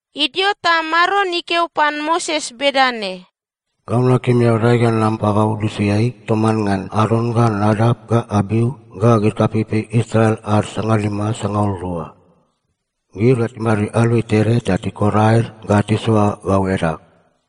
Idio ta Maron ikeo pan Moses bedane, “Gau nakim eao dae ga nam pagau lusiai toman ngan Aron ga Nadap ga Abiu ga gid kapeipei Israel ad sangalima sangaul rua. Gid ga timadid aluai tede ta tikor aed ga tisoa gau edag.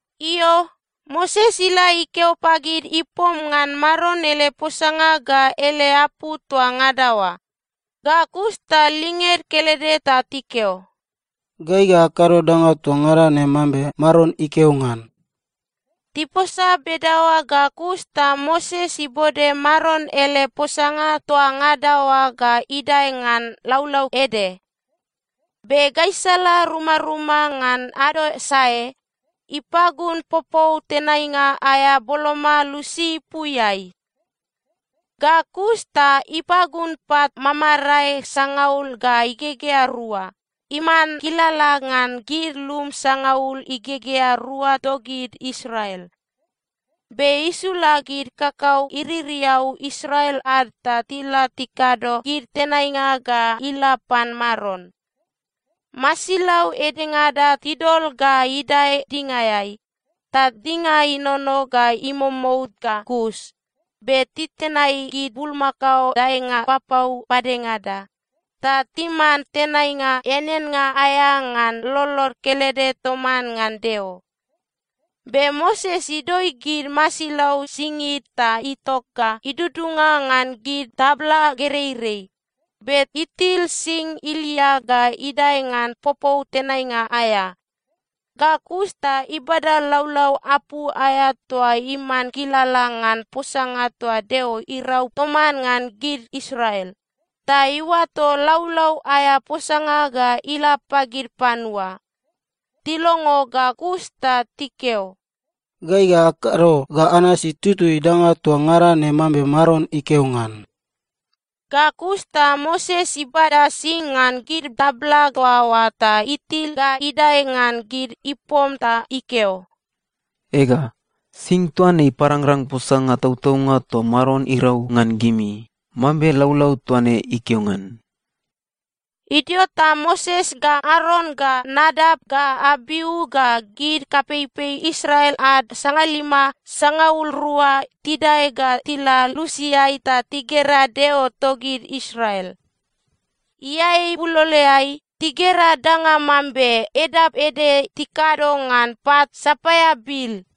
Io, Moses ila ikeo pagid ipom ngan Maron ele posanga ga ele apu toa ngada oa. Ga kus ta linged kelede ta tikeo, “Gai ga akado danga toa ngada ne mambe Maron ikeo ngan.” Tiposa bedaoa ga kus ta Moses ibode Maron ele posanga toa ngada oa ga idae ngan laulau ede. Be gaisala rumaruma ngan ado sae, ipagun popou tenainga aea boloma lusi ipuiai. Ga kus ta ipagun pat mamamarae sangaul ga igegea rua, iman kilala ngan gid lum sangaul igegea rua togid Israel. Be isula gid kakau iririau Israel ad ta tila tikado gid tenainga ga ila pan Maron. Masilau edengada tidol ga idae dingaeai, ta dinga inono ga imomout ga kus, be titenai gid bulmakao daenga papau padengada, ta timan tenainga eaneannga aea ngan lolod kelede toman ngan Deo. Be Moses idoi gid masilau singid ta itok ga idudunga ngan gid tabla gereirei, be itil sing ilia ga idae ngan popou tenainga aea. Ga kus ta ibada laulau apu aea toa iman kilala ngan posanga toa Deo irau toman ngan gid Israel, ta iuato laulau aea posanga ga ila pagid panua. Tilongo ga kus ta tikeo, “Gai ga akado ga anasi tutui danga toa ngada ne mambe Maron ikeo ngan.” Ga kus ta Moses ibada sing ngan gid tabla toa oa ta itil ga idae ngan gid ipom ta ikeo, “Ega, sing toa ne iparangrang posanga tautaunga toa Maron irau ngan gimi, mambe laulau toa ne ikeo ngan.” Idio ta Moses ga Aron ga Nadap ga Abiu ga gid kapeipei Israel ad sangalima sangaul rua tidae ga tila lusiai ta tigera Deo togid Israel. Iae ibuloloeai, tigera danga mambe edap ede tikado ngan pat sapaia bil.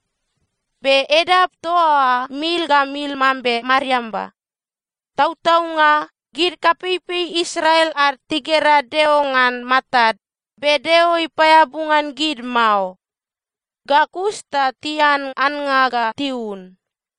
Be edap toa oa mil ga mil mambe mariamba. Tautaunga, gid kapeipei Israel ad tigera Deo ngan matad, be Deo ipaeabu ngan gid mao. Ga kus ta tian annga ga tiun.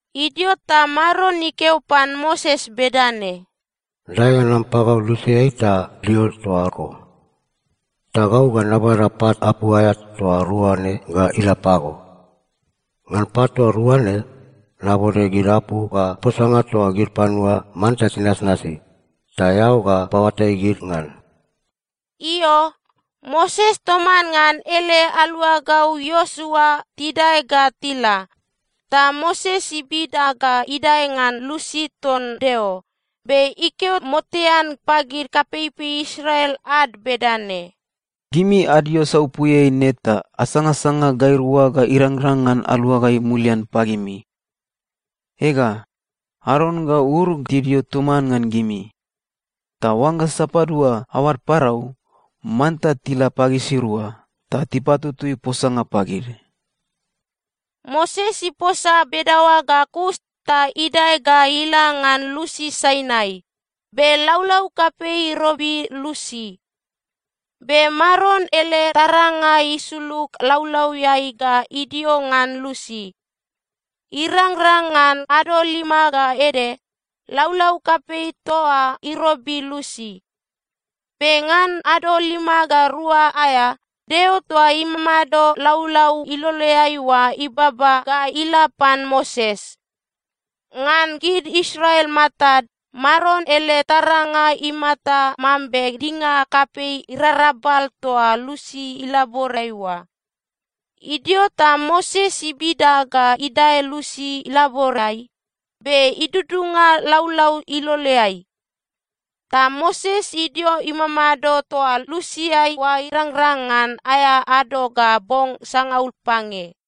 Idio ta Maron ikeo pan Moses bedane, “Dae ga nam pagau lusiai ta dio toa eko. Ta gau ga nabada pat apu aea toa rua ne ga ila pago. Ngan pat toa rua ne, nabode gid apu ga posanga toa gid panua manta tinasnasi, ta eao ga paoatai gid ngan.” Io, Moses toman ngan ele aluagau Iosua tidae ga tila, ta Moses ibida ga idae ngan lusi ton Deo. Be ikeo motean pagid kapeipei Israel ad bedane, “Gimi adio saupuiai ne ta asangasanga gairua ga irangrang ngan aluagai mulian pagimi. Ega, Aron ga Ur tidio toman ngan gimi. Ta oangga sapadua aoad parau, manta tila pagisirua, ta tipatutui posanga pagid.” Moses iposa bedaoa ga kus ta idae ga ila ngan lusi Sainai, be laulau kapei irobi lusi. Be Maron ele taranga isulug laulauiai ga idio ngan lusi. Irangrang ngan ado lima ga ede, laulau kapei toa oa irobi lusi. Be ngan ado lima ga rua aea, Deo toa imamado laulau iloleai oa ibaba ga ila pan Moses. Ngan gid Israel matad, Maron ele taranga imata mambe dinga kapei irarabal toa lusi ilaborai oa. Idio ta Moses ibida ga idae lusi ilaborai, be idudunga laulau iloleai. Ta Moses idio imamado toa lusiai oa irangrang ngan aea ado ga bong sangaul pange.